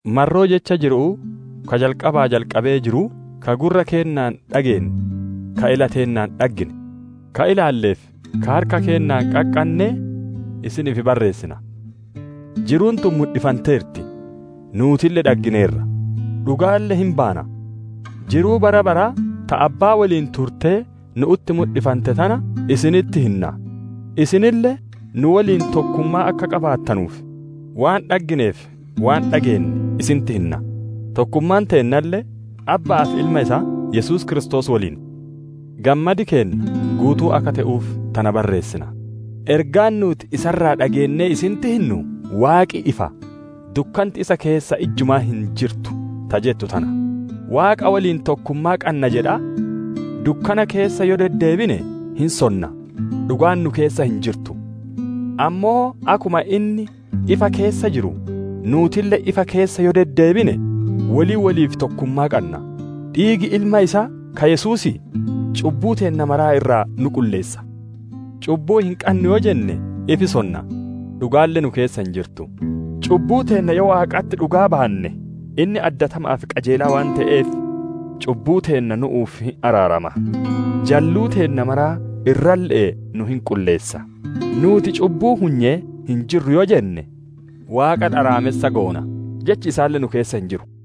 Marroo jecha jiru'uu ka jalqabaa jalqabee jiruu, ka gurra keennaan dhageenne, ka ila teennaan dhaggine, ka ilaallee fi ka harka keennaan qaqqannee isiniif barreessina. Jiruun tun mudhifanteerti; nuutille dhaggineerra, dhugaalle hin baana. Jiruu bara baraa ta Abbaa woliin turtee, nu'utti mudhifante tana isinitti hinna. Isinille nu woliin tokkummaa akka qabaattanuuf, waan dhagginee fi waan dhageenne isinitti hinna; tokkummaan teennalle Abba'aa fi Ilma isaa Yesuus Kiristoos woliin. Gammadi keenna guutuu akka te'uuf tana barreessina. Ergaan nuuti isa irraa dhageennee isinitti hinnu, «Waaqi ifa; dukkanti isa keessa ijjumaa hin jirtu» ta jettu tana. Waaqa woliin tokkummaa qanna jedhaa, dukkana keessa yoo deddeebine hin sonna; dhugaan nu keessa hin jirtu. Ammoo akkuma inni ifa keessa jiru, nuutille ifa keessa yoo deddeebine woli woliif tokkummaa qanna; dhiigi Ilma isaa ka Yesuusii, cubbuu teenna mara irraa nu qulleessa. Cubbuu hin qannu yoo jenne ifi sonna; dhugaalle nu keessa hin jirtu. Cubbuu teenna yoo Waaqatti dhugaa baanne inni addatama'aa fi qajeelaa waan te'eef cubbuu teenna nu'uuf hin araarama; jalluu teenna mara irralle'ee nu hin qulleessa. Nuuti cubbuu hunyee hin jirru yoo jenne, Waaqa dharaamessa goona; jechi isaalle nu keessa hin jiru.